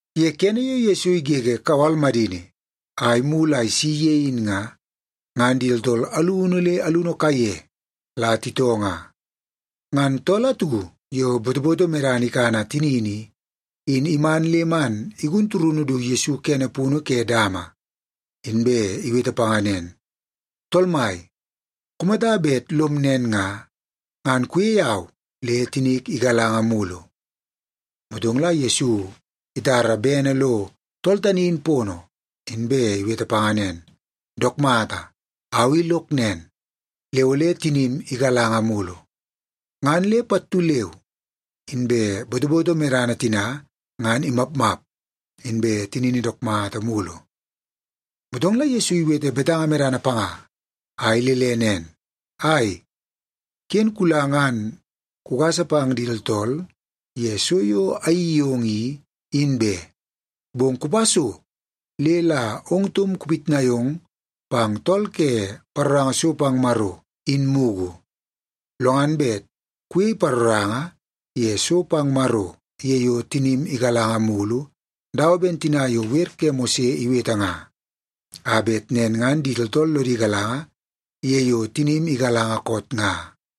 Ye kene yo Yesu igege kawal madini a imulu a isi ye in nga, ngan di tooltool alunu le alunu kaiye la titoo nga. Ngan tool atu yo botoboto medana ikana tinini i, in iman le man igun turunu du Yesu kene punu ke dama, inbe iwete panga nen, “Tool Mai, kumata bet lom nen nga, ngan kuyei au le tinik igalanga mulu.” Motong la Yesu itara bene lo tool tani in pono, inbe iwete panga nen, “Dook mata, au i lok nen, le ole tinim igalanga mulu.” Ngan le pattu leu inbe botoboto medana tina ngan imapmap, inbe tinini dook mata mulu. Motong la Yesu iwete betanga medana panga a ilele nen, “Ai, ken kula ngan kugasa pang di tooltool ye so yo ayeii yong i, in be. Bong kupa so le la ong taum kupitnai ong pang tool ke paroranga so pang Maro in mugu. Lo ngan bet kuyei paroranga ye so pang Maro ye yo tinim igalanga mulu, dawa ben tina yo wer ke Mose iwete nga, a bet nen ngan di tooltool lodi galanga ye yo tinim igalanga koot nga.”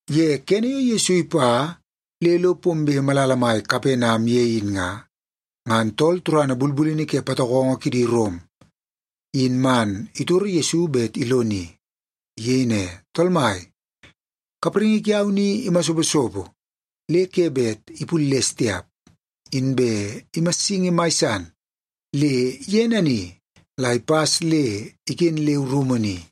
Ye kene yo Yesu ipa le lo pombe malala mai Kapenam ye in nga, ngan tool turana bulbulini ke patokongo kidi Rom, in man itoro Yesu bet iloni. Iyei ne, “Tool Mai, kapraingi kiau ni imasoposopo le ke bet ipulles tiap, inbe imassingi mai san le ye nani la ipas le iken leu rumu ni.”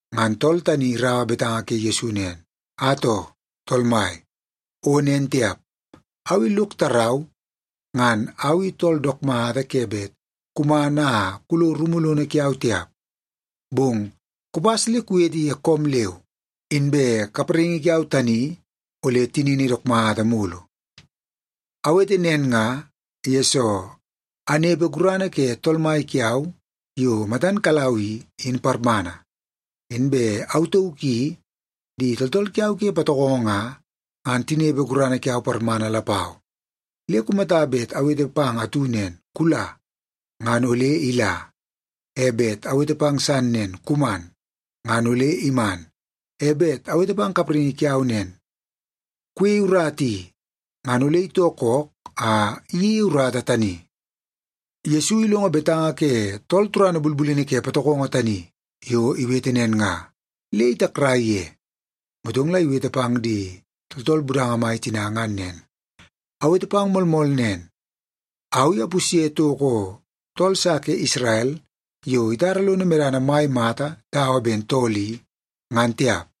Ngan tool tani iraua betanga ke Yesu nen, “Atoo, Tool Mai, o nen tiap! Au i lok tarau ngan au i tool dook mata ke bet kuman a kulo rumu lono kiau tiap. Bong kupas le kuwete ye koom leu, inbe kapraingi kiau tani ole tinini dook mata mulu. Awete nen nga, yesoo anepe gurana ke tool mai kiau yo matan kalau i, in parmana. Inbe au tauk i di tooltool kiau ke patokongo nga, ngan tinepe gurana kiau parmana lapau. Le kumata bet awete pang atu nen, ‘Kula,’ ngan ole ila. E bet awete pang san nen, ‘Kuman,’ ngan ole iman. E bet awete pang kapraingi kiau nen, ‘Kuyeie urata i,’ ngan ole itoo kook a iyeie urata tani.” Yesu ilongo betanga ke tool turana bulbulini ke patokongo tani yo iwete nen nga, le itakrai ye. Motong la iwete pang di tooltool budanga mai tina ngan nen, “Awete pang moolmool nen, au i apusye toko tool sa ke Isrel yo itara lono medana mai mata dawa ben tool i, ngan tiap.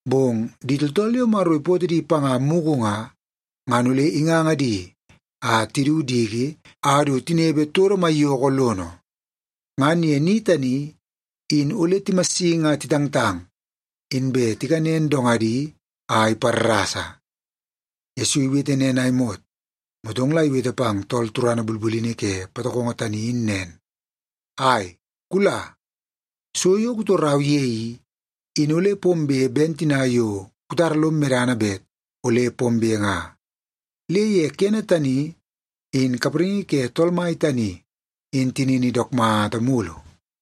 Bong di tooltool yo Maro ipootoo di panga mugu nga, ngan ole inganga di a tidu diki a du tinepe todo maiyoko lono. Ngan ye ni tani in ole timassingi a titangtang, inbe tikanen dongadi a iparrasa.” Yesu iwete nen a imot, motong la iwete pang tool turana bulbulini ke patokongo tani in nen, “Ai, kula. So yo kutorau ye i, in ole pombe ben tina yo kutara lom medana bet ole pombe nga.” Le ye kene tani, in kapraingi ke tool mai tani in tinini dook mata mulu.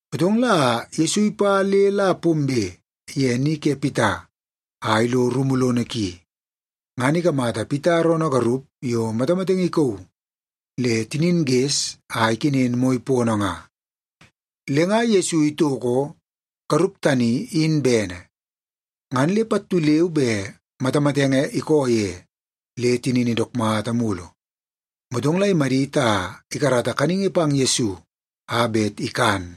Motong la Yesu ipa le la pombe ye ni ke Pita, a ilo rumu lono ki. Ngan ikamata Pita roonoo garup yo matamatenge ikauu le tinin ges a ikenen moi pono nga. Le nga Yesu itoko garup tani in bene, ngan le pattu leu be matamatenge ikoo ye le tinini dook mata mulu. Motong la imadit a ikarata kaningi pang Yesu a bet ikan.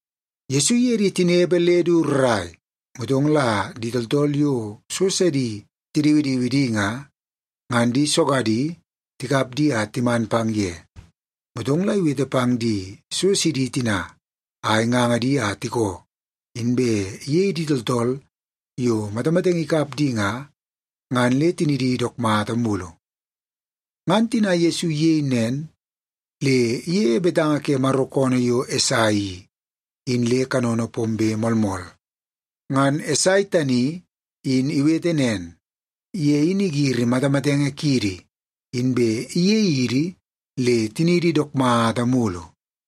Yesu iye di tinepe le du rrai, motong la di tooltool yo so sidi tidiwidiwi di nga, ngan di sogadi tikap di a timan pang ye. Motong la iwete pang di so sidi tina a inganga di a tikoo, inbe iyei di tooltool yo matamatenge ikap di nga, ngan le tinidi dook mata mulu. Ngan tina Yesu iyei nen, le iyeie betanga ke Maro koonoo yo Esai i, in le kanono pombe moolmool. Ngan Esai tani in iwete nen, “Ye in igiri matamatenge kiidi, inbe iyei idi le tiniidi dook mata mulu.”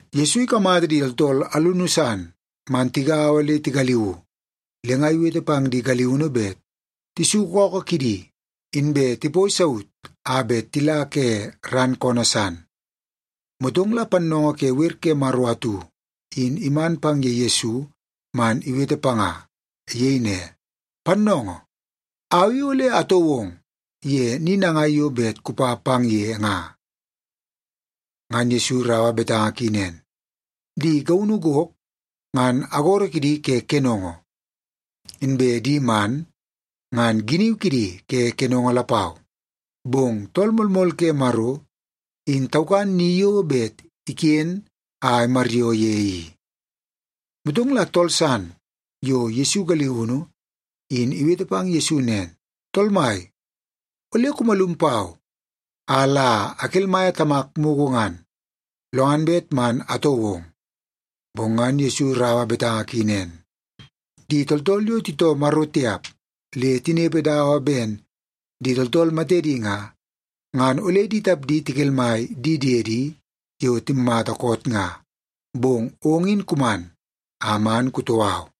Yesu ikamata di tooltool alunu san man tigaua le tigaliuu, le nga iwete pang di galiunu bet tisuku ookoo kidi inbe tipoi saut a bet tila ke ran koonoo san. Motong la pannoongoo ke wer ke Maro atu in iman pang ye Yesu man iwete panga. Iyei ne, “Pannoongoo, au i ole atoo ong ye ni nangai yo bet kupa pang ye nga.” Ngan Yesu iraua betanga ki nen, “Di gaunu gok ngan agoro kidi ke kenongo, inbe di man ngan giniu kidi ke kenongo lapau, bong Tool Moolmool ke Maro, in taukan ni yo bet iken a imaryoo ye i.” Motong la tool san yo Yesu galiunu, in iwete pang Yesu nen, “Tool mai, ole kumalum pau a la akelmaia tamak mugu ngan, lo ngan bet man atoo ong.” Bong ngan Yesu iraua betanga ki nen, “Di tooltool yo titoo Maro tiap le tinepe dawa ben di tooltool matedi nga, ngan ole di tapdi tikelmai di diedi yo timmata koot nga. Bong ong in kuman a man kutoo au.”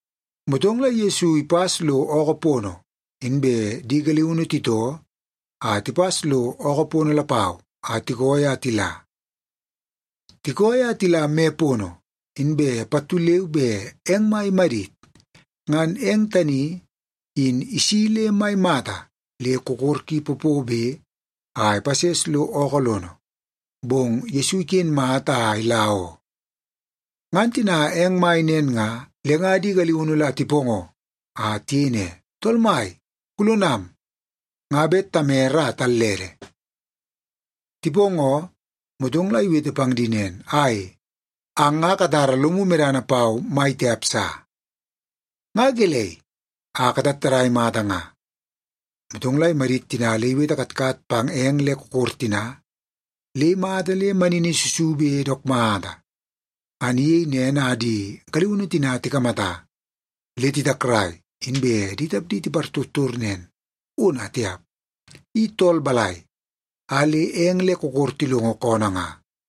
Motong la Yesu ipas lo ookoo pono, inbe di galiunu titoo a tipas lo ookoo pono lapau a tikooi a tila. Tikooi a tila me pono, inbe pattu leu be eng mai imadit. Ngan eng tani in isi le mai mata, le kokor ki popobe a ipases lo ookoo lono, bong Yesu iken mata a ila oo. Ngan tina eng mai nen nga, le nga di galiunu la tipoongoo a tiyei ne, “Tool Mai, kulonam! Nga bet tamere a tallede!” Tipoongoo, motong la iwete pang di nen, “Ai, ang nga katara lomu medana pau mai tiap sa. Nga gelei a katattadai mata nga?” Motong la imadit tina le iwete katkat pang eng le kokor tina, le imata le manini susube dook mata. Ngan iyei nen a di galiunu tina tikamata, le titakrai, inbe di tapdi tipartortor nen, “Ona tiap! I tool balai a le eng le kokor tilongo koonoo nga?”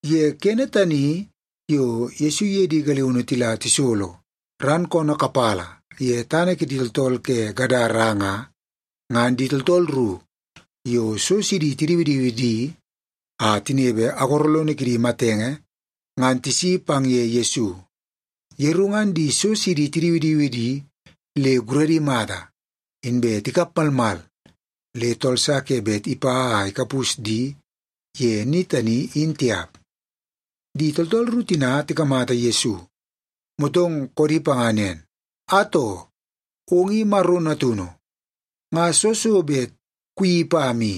Ye kene tani yo Yesu iye di galiunu tila tisolo ran koonoo kapala ye tana kidi tooltool ke Gadara nga, ngan di tooltool ru yo so sidi tidiwidiwi di a tinepe agoro lono kidi matenge ngan tisi pang ye Yesu. Yeru ngan di so sidi tidiwidiwi di le guradi mata, inbe tikap malmal le tool sa ke bet ipa a ikapus di ye ni tani, in tiap. Di tooltool ru tina tikamata Yesu, motong koodi panga nen, “Atoo! Ong i Maro Natunu. Nga soo so bet kuyeii pam i?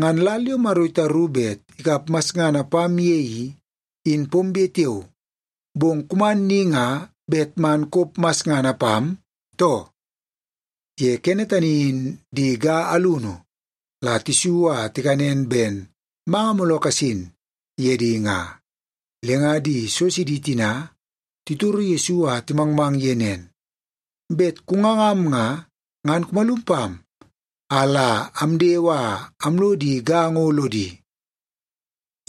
Ngan lal yo Maro itaru bet ikap masngana pam ye i, in pombe tiao, bong kuman ni nga bet man kop masngana pam, too?” Ye kene tani in di ga alunu la tisu a tikanen ben manga mooloo kasin ye di nga. Le nga di so sidi tina titoro Yesu a timangmang ye nen, “Bet kungangam nga, ngan kumalum pam a la amdewe a amlo di ga ngo lodi.”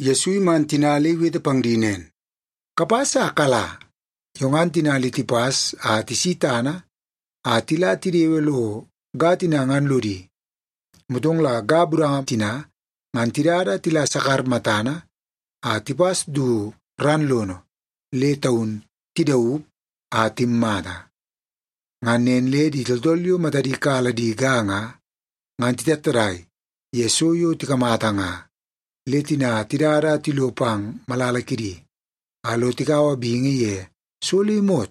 Yesu iman tina le iwete pang di nen, “Kapas a kala.” Yo ngan tina le tipas a tisi tana a tila tidewe lo ga tina ngan lodi. Motong la ga budanga tina ngan tidada a tila sakar matana a tipas du ran lono le taun tidaup a timmata. Ngan nen le di tooltool yo matadi kala di ga nga, ngan titattadai ye so yo tikamata nga. Le tina tidada a tilo pang malala kidi, a lo tikaua bingi ye so le imot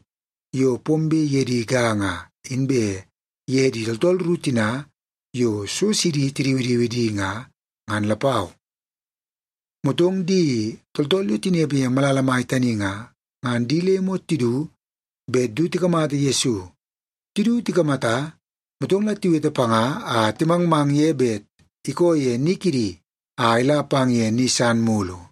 yo pombe ye di ga nga, inbe ye di tooltool ru tina yo so sidi tidiwidiwi di nga, ngan lapau. Motong di tooltool yo tinepe ye malala mai tani nga, ngan di le imot tidu bet du tikamata Yesu. Tidu tikamata, motong la tiwete panga a timangmang ye bet ikoo ye ni kidi a ila pang ye ni san mulu.